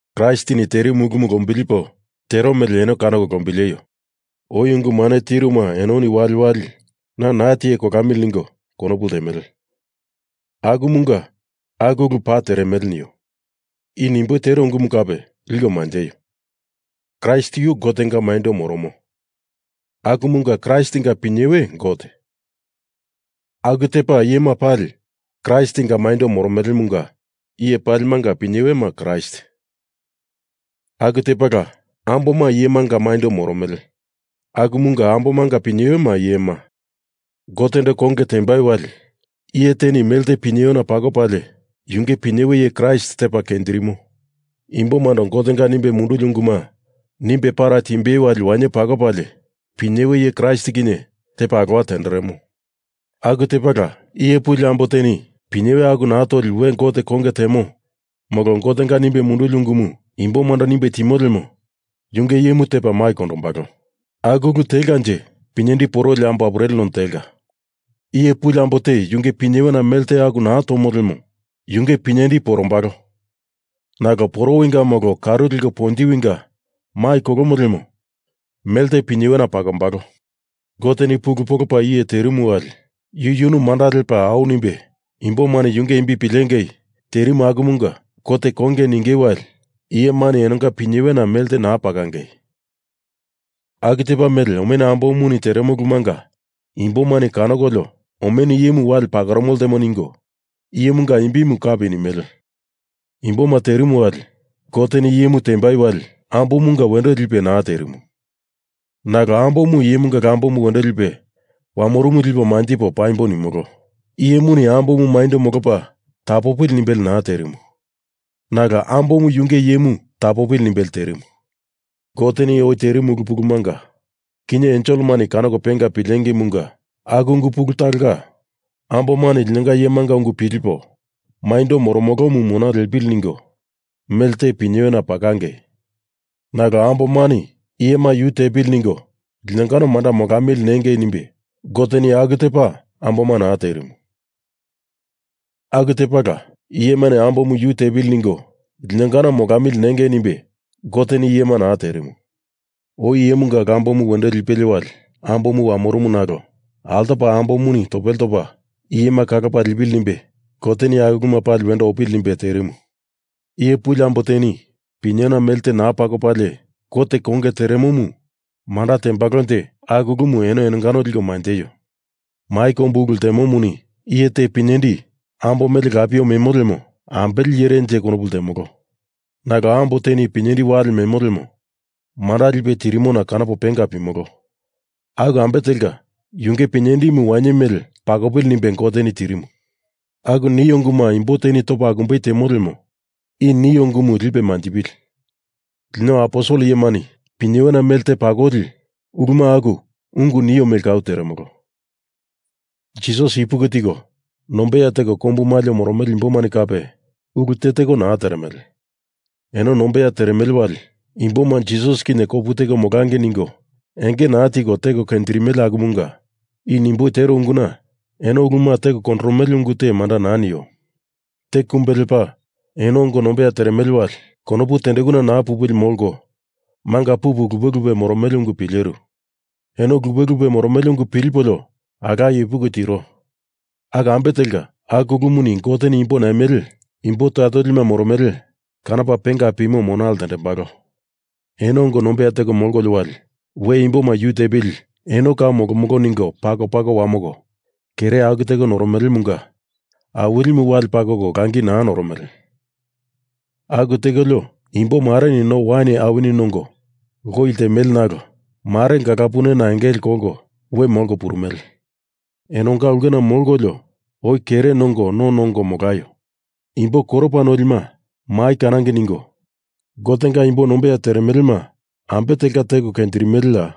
Kraistini terimu ulumu lombilipo tero mele eno kanoko lombileio. Oi ungu mane tiruma enoni waliwali na naa tiye kolamili ningo konopu ltemele. Akumunga aku ulumu paa teremele nio. I nimboi tero ungumu kape liko manjeio. Kraist yu Gotenga maindo moromo akumunga Kraistinga pinyewe Gote. Aku tepa iyema pali Kraistinga maindo moromelemunga iye palimanga pinyewema Kraist. Aku tepala amboma iyemanga maindo moromele akumunga ambomanga pinyewema iyema. Gotendo konge tembai wali iye teni melte pinyewena pakopalie yunge pinyewe iye Kraist tepa kenjirimo. Imbomando Gotenga nimbe munduli unguma nimbe para timbei wali wainye pakopalie pinyewe iye Kraist kinye tepa alowa tenderemo. Aku tepala iye puli ambo teni pinyewe aku naa toli we Gotendo konge temo molo Gotenga nimbe munduli ungumu imbomando nimbe timo lemo yunge iyemu tepa mai kondombalo. Aku ulu telkanje pinyendi poroli ambo apureli none telka. Iye puli ambo te yunge pinyewena mele te aku naa tomo lemo yunge pinyendi porombalo. Nalo porowinga molo karu leko ponjiwinga mai kolomo lemo mele te pinyewena pakombalo. Goteni pulu polopa iye terimu wali yu yunu manda lepa au nimbe imbomani yunge imbi pilengei terimu akumunga Gote konge ningei wali iyemani enonga pinyewena mele te naa pakonge. Aku tepa mele omenu ambomuni teremo ulumanga imbomani kanokolio omenu iyemu wale pakoromo ltemo ningo iyemunga imbimu kapi nimele. Imboma terimu wali Goteni iyemu tembai wali ambomunga wendo lipe naa terimu, nalo ambomu iyemunga lambomu wendo lipe wamorumu lipo manjipo paimbo nimolo. Iyemuni ambomu maindo molopa tapopili nimbelie naa terimu, nalo ambomu yunge iyemu tapopili nimbelie terimu. Goteni oi terimu ulu pulumunga kinye enselemani kanoko penga pilengeimunga aku ungu pulu talonga ambomani linonga iyemanga ungu pilipo maindo moromolomu mona lepili ningo mele te pinyewena pakangei. Nalo ambomani iyemu yu tepili ningo linongano manda molamili nengei nimbe Goteni aku tepa amboma naa terimu. Aku tepala iyemani ambomu yu tepili ningo linongano molamili nengei nimbe Goteni iyema naa terimu. Oi iyemunga lambomu wendo lipelie wali ambomu wamorumu nalo altopa ambomuni topele topa iyema kalopa lipili nimbe Goteni aku uluma pali wendo opili nimbe terimu. Iye puli ambo teni pinyewena mele te naa pakopalie Gotendo konge teremomu manda tembalonje aku ulumu eno enongano liko manjeio. Mai kombu ulu ltemomuni iye te pinyendi ambo mele lapie memo lemo ambele iyerenje konopu ltemolo. Nalo ambo teni pinyendi wale memo lemo manda lipe tirimona kanopo penga pimolo. Aku ambe telka yunge pinyendimuni wainye mele pakopili nimbe Goteni tirimu. Aku nio unguma imbo teni topa akumbei temo lemo i nio ungumu lipe manjipili. Lino aposel iyemani pinyewena mele te pakoli uluma aku ungu nio mele kau teremolo. Jisas ipuki tiko nombeya teko kombu maliona moromele imbomani kape ulu teteko naa teremele. Eno nombeya teremele wali imboma Jisas kinye kopu teko molangei ningo enge naa tiko teko kenjirimele akumunga i nimboi tero unguna eno uluma teko kondoromele ungu te manda naa nio. Te kumbe lepa, eno ongo nombeya teremele wali konopu tendekuna naa pupili molko manga pupu lupe lupe moromele ungu pileru. Eno lupe lupe moromele ungu pilipolio alaye ipuki tiro. Aku ambe telka aku ulumuni Goteni imbo naimele imbo toya tolima moromele kanopa penga pimo mona ltendembalo. Eno ongo nombeya teko molkolio wali we imboma yu tepili eno kau nomolo ningo pako pako wamoko kere aku teko noromelemunga Awilimu wale pakoko langi naa noromele. Aku tekolio imbo mareni no wain awini nongo lowi ltemele nalo mare gala punena engele kolko we molko purumele. Enonga ulkena molkolio oi kere nongo no nongo molaio. Imbo koropa nolima mai kanangei ningo Gotenga imbo nombeya teremelema ambe telka teko kenjirimeleya?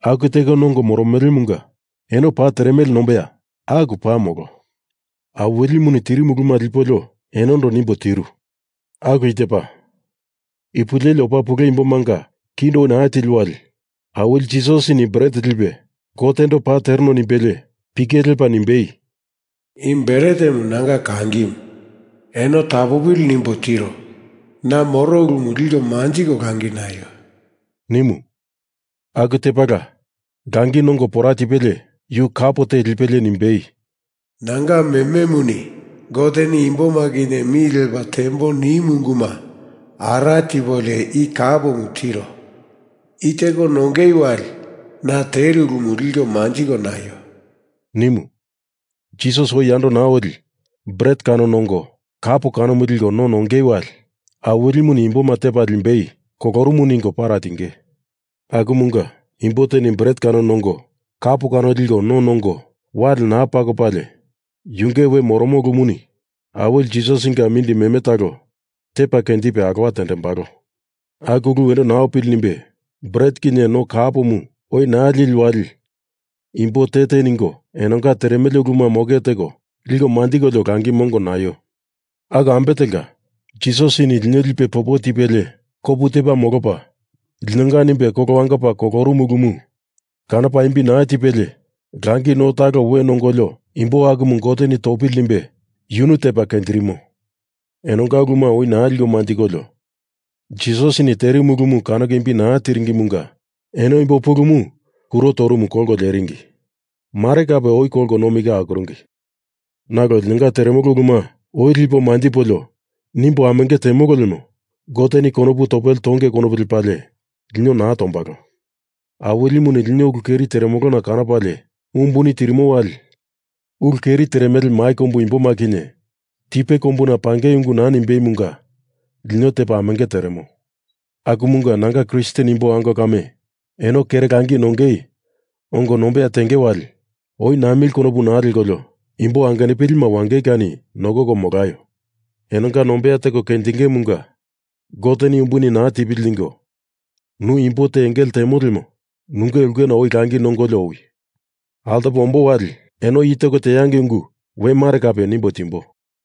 Aku teko nongo moromelemunga eno paa teremele nemboya? Aku paa molo. Awilimuni tirimu uluma lipolio enondo nimbo tiru. Aku i tepa. Ipu leli opa pule imbomanga kindo oi naa tili wali, Awili Jisasini bret lipe Gotendo paa tereno nimbelie pike lepa nimbei, “I bretemu nanga kangimu. Eno tapopili nimbo tiro. Na moro ulumu liko manjiko langi naio,” nimu. Aku tepala langi nongo pora tipelie yu kap te lipelie nimbei, “Nanga mememuni Goteni imboma kinye mi lepa tembo nimu unguma ara tipolio i kapomu tiro. I teko nongei wali na teru ulumu liko manjiko naio,” nimu. Jisas oi yando naa oli bret kano nongo kap kano liko no nongei wali Awilimuni imboma tepa limbei kolorumu ningo para tinge. Akumunga, imbo teni bret kano nongo kap kano liko no nongo wale naa pakopalie yunge noromo ulumuni Awili Jisasinga mindi meme talo tepa kenjipe alowa tendembalo. Aku ulu wendo naa opili nimbe bret kinye no kapomu oi naa lili wali imbo te te ningo enonga teremele uluma moke teko liko manjikolio langi mongo naio. Aku ambe telka, Jisasini lino lipe popo tipelie kopu tepa molopa linonga nimbe kolo wangopa kolorumu ulumu kanopa imbi naa tipelie langi no talo we nongolio imbo akumu Goteni topili nimbe yunu tepa kenjirimo. Enonga uluma oi naa liko manjikolio Jisasini terimu ulumu kanoko imbi naa tiringimunga eno imbo pulumu kuro torumu kolko leringi. Mare kape oi kolko nomi ka akuringi. Nalo linonga teremolo uluma oi lipo manjipolio nimbo amenge temolo lemo Goteni konopu topele tonge konopu lepalie lino naa tombalo. Awilimuni lino ulu keri teremolona kanopalie umbuni tirimo wali ulu keri teremele mai kombu imboma kinye tipe kombuna pangei ungu naa nimbeimunga lino tepa amenge teremo. Akumunga nanga Kristen imbo ango kame eno kere langi nongei ongo nombeya tenge wali oi namili konopu naa lekolio imbo angenupilima wangei kani nokoko molaio. Enonga nombeya teko kenjingeimunga Goteni umbuni naa tipili ningo nu imbo te engele temo lemo nunge ulkena oi langi nongolio owi. Altopo ombo wali eno i teko teangei ungu we mare kape nimbo timbo.